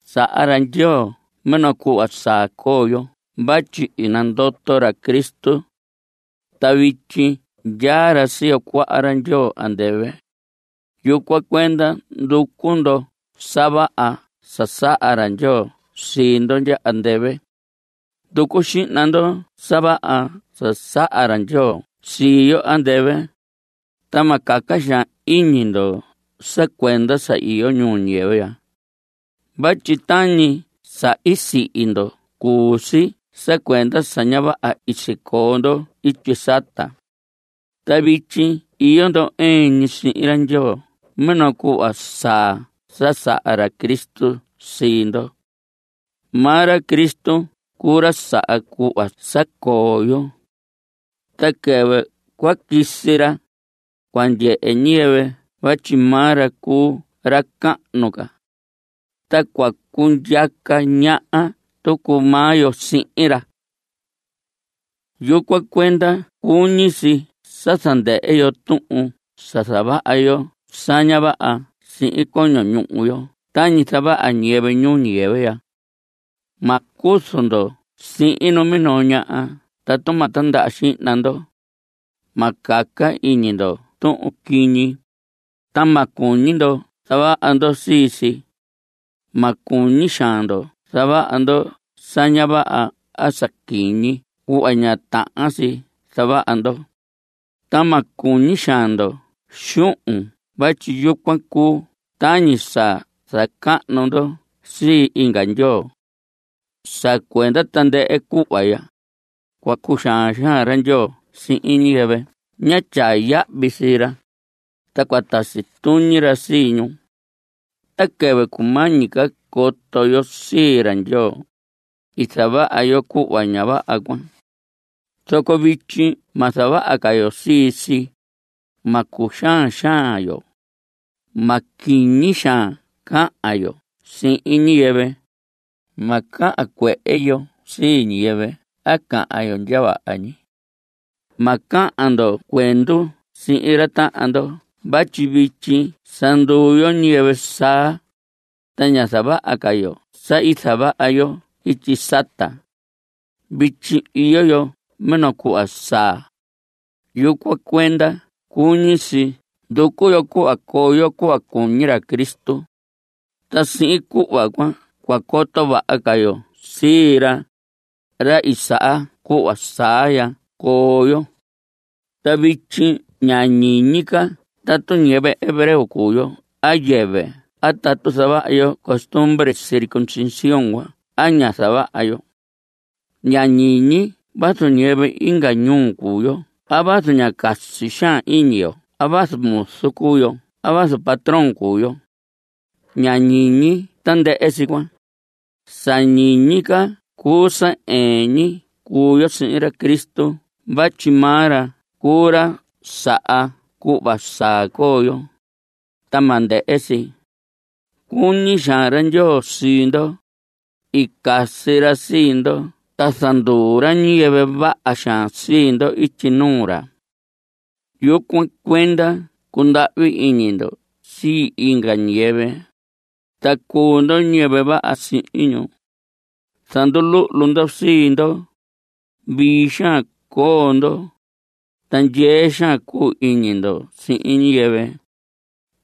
Saha ra Ndyoo minoo cuhva saa coo yo vatyi i nandoto ra Cristo. Ta vityi ndyaa ra siyo cuaha ra Ndyoo andɨvɨ. Yucuan cuenda nducu ndo sa vaha sa saha ra Ndyoo sii ndo ndya andɨvɨ. Nducu xihna ndo sa vaha sa saha ra Ndyoo sii yo andɨvɨ. Ta ma caca xaan iñi ndo sa cuenda sa iyo ñuu ñiyɨvɨ ya. Vatyi tañi sa i sihi ndo cuu si sa cuenda sa ña vaha i sicoo ndo ityi sata. Ta vityi iyo ndo ɨɨn ñi sihin ra Ndyoo minoo cuhva saa sa saha ra Cristo sii ndo. Maa ra Cristo cuu ra saha cuhva saa ya coo yo. Ta quɨvɨ cua quisi ra, cua ndyehe ñiyɨvɨ vatyi maa ra cuu ra cahnu ca. Ta cua cundyaca ñaha tucu maa yo sihin ra. Yucuan cuenda cuñi si sa zandɨhɨ yo tuhun sa zavaha yo sa ña vaha sihin coño ñuhu yo tañi zavaha ñiyɨvɨ ñuu ñiyɨvɨ ya. Ma cuzu ndo sihin minoo ñaha tatu ma tindaha xihna ndo. Ma caca iñi ndo tuhun quiñi, ta ma cuñi ndo zavaha ndo sii si. Ma cuñi xaan ndo zavaha ndo sa ña vaha a sa quiñi cuhva ña tahan si zavaha ndo, ta ma cuñi xaan ndo xuhun vatyi yucuan cuu tañi sa zacahnu ndo sii inga ndyoo. Sa cuenda tandɨhɨ cuhva ya, cua cuxaan xaan ra Ndyoo sihin ñiyɨvɨ ña tyaa yahvi sii ra, ta cua tasi tuñi ra sii ñu. Ta quɨvɨ cumañi ca coto yo sii ra Ndyoo, i zavaha yo cuhva ña vaha cuan. Zoco vityi ma zavaha ca yo sii si. Ma cuxaan xaan yo. Ma quiñi xaan cahan yo sihin ñiyɨvɨ. Ma cahan cuehe yo sii ñiyɨvɨ a cahan yo ndya vaha ñi. Ma cahan ndo cuendu sihin ra tahan ndo vatyi vityi sa nduu yo ñiyɨvɨ saa, ta ña zavaha ca yo sa i zavaha yo ityi sata. Vityi iyo yo minoo cuhva saa. Yucuan cuenda cuñi si nducu yo cuhva coo yo cuhva cuñi ra Cristo. Ta sihin cuhva cuan cua coto vaha ca yo sii ra, ra i saha cuhva saa ya coo yo. Ta vityi ña ñiñi ca tatu ñiyɨvɨ hebreo cuu yo a yɨvɨ a tatu zavaha yo costumbre circuncisión a ña zavaha yo. Ña ñiñi vazu ñiyɨvɨ inga ñuu cuu yo a vazu ña casi xaan iñi yo a vazu muzu cuu yo a vazu patrón cuu yo. Ña ñiñi tandɨhɨ si cuan. Sa ñiñi ca cuu sa ɨɨn ñi cuu yo sihin ra Cristo vatyi maa ra cuu ra saha cuhva saa coo yo, ta ma ndɨhɨ si. Cuñi xaan ra Ndyoo sii ndo. I casi ra sii ndo ta zanduu ra ñiyɨvɨ vaha xaan sii ndo ityi nuu ra. Yucuan cuenda cundahvi iñi ndo sii inga ñiyɨvɨ, ta cuu ndo ñiyɨvɨ vaha sihin ñu. Zanduluhlu ndo sii ndo. Vii xaan coo ndo, ta ndyee xaan cuu iñi ndo sihin ñiyɨvɨ.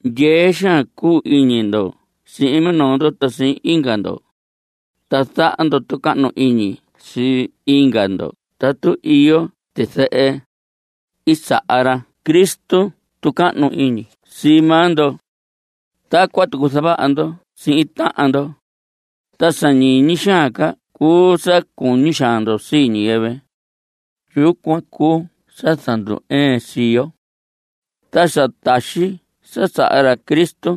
Ndyee xaan cuu iñi ndo sihin minoo ndo ta sihin inga ndo, ta zaha ndo tucahnu iñi sii inga ndo tatu iyo tizɨhɨ. I zaha ra Cristo tucahnu iñi sii maa ndo. Tacuan tucu zavaha ndo sihin tahan ndo. Ta sa ñiñi xaan ca cuu sa cuñi xaan ndo sii ñiyɨvɨ. Yucuan cuu sa zandu‑ɨɨn sii yo. Ta sa taxi sa saha ra Cristo,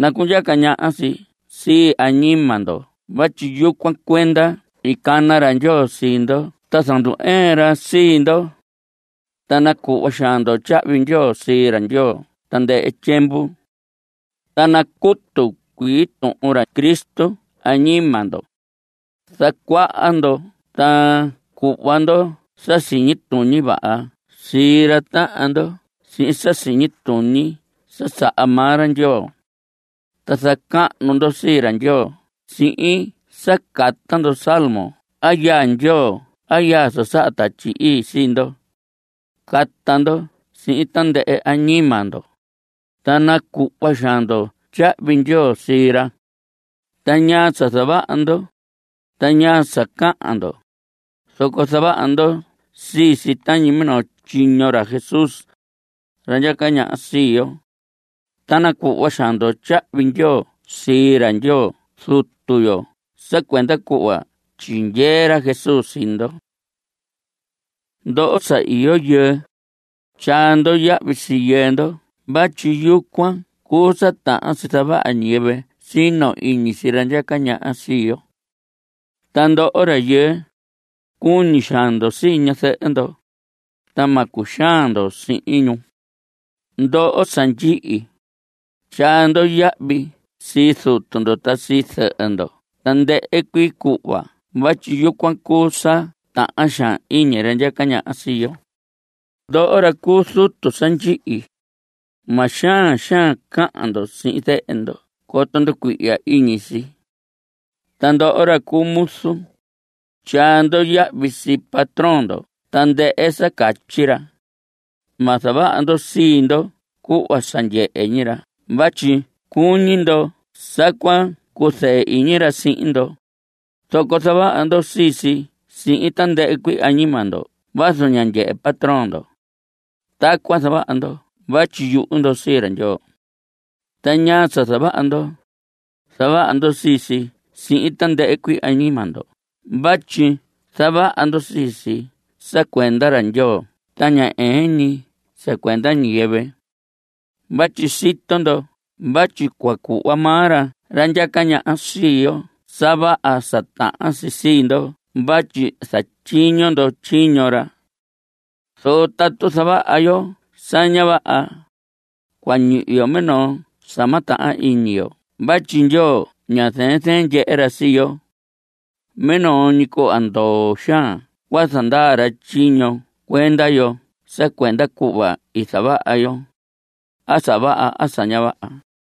nacundyaca ñaha si sii añima ndo vatyi yucuan cuenda i cana ra Ndyoo sii ndo ta zandu‑ɨɨn ra sii ndo. Ta nacuhva xaan ndo tyahvi ndyoo sii ra Ndyoo tandɨhɨ tyiemvu. Ta nacutu cuii tuhun ra Cristo añima ndo. Zacuaha ndo ta cuhva ndo sa siñi tuñi vaha sii ra tahan ndo sihin sa siñi tuñi sa saha maa ra Ndyoo. Ta zacahnu ndo sii ra Ndyoo sihin sa cata ndo salmo a yaa Ndyoo a yaa sa saha Tatyi Ii sii ndo. Cata ndo sihin tandɨhɨ añima ndo. Ta nacuhva xaan ndo tyahvi ndyoo sii ra. Ta ñaa sa zavaha ndo, ta ñaa sa cahan ndo, zoco zavaha ndo sii si tañi minoo tyiño ra Jesús, ra ndyaca ñaha sii yo. Ta nacuhva xaan ndo tyahvi ndyoo sii ra Ndyoo Zutu yo sa cuenda cuhva tyindyee ra Jesús sii ndo. Ndoho sa iyo yɨɨ, tyaa ndo yahvi sii yɨɨ ndo vatyi yucuan cuu sa tahan si zavaha ñiyɨvɨ sino iñi sii ra ndyaca ñaha sii yo. Ta ndoho rayɨɨ, cuñi xaan ndo sii ñazɨhɨ ndo. Ta ma cuxaan ndo sihin ñu. Ndoho sa ndyihi, tyaa ndo yahvi sii zutu ndo ta sii zɨhɨ ndo tandɨhɨ cuii cuhva vatyi yucuan cuu sa tahan xaan iñi ra ndyaca ñaha sii yo. Ndoho ra cuu zutu sa ndyihi, ma xaan xaan cahan ndo sihin zehe ndo coto nducuihya iñi si. Ta ndoho ra cu muzu, tyaa ndo yahvi sii patrón ndo tandɨhɨ sa catyi ra. Ma zavaha ndo sii ndo cuhva sa ndyehe ñi ra vatyi cuñi ndo sa cua cuzɨɨ iñi ra sihin ndo, zoco zavaha ndo sii si sihin tandɨhɨ añima ndo vazu ña ndyehe patrón ndo. Tacuan zavaha ndo vatyi yuhu ndo sii ra Ndyoo. Ta ñaa sa zavaha ndo, zavaha ndo sii si sihin tandɨhɨ cuii añima ndo vatyi zavaha ndo sii si sa cuenda ra Ndyoo ta ña ɨɨn ñi sa cuenda ñiyɨvɨ. Vatyi sito ndo vatyi cua cuhva maa ra ndyaca ñaha sii yo sa vaha sa tahan si sii ndo vatyi zatyiño ndo tyiño ra. Zoco tatu zavaha yo sa ña vaha, cua ñihi yo minoo sa ma tahan iñi yo vatyi Ndyoo ña zɨɨn zɨɨn ndyehe ra sii yo. Minoo cuhva ndoo xaan cua zandaa ra tyiño cuenda yo sa cuenda cuhva i zavaha yo, a sa vaha a sa ña vaha.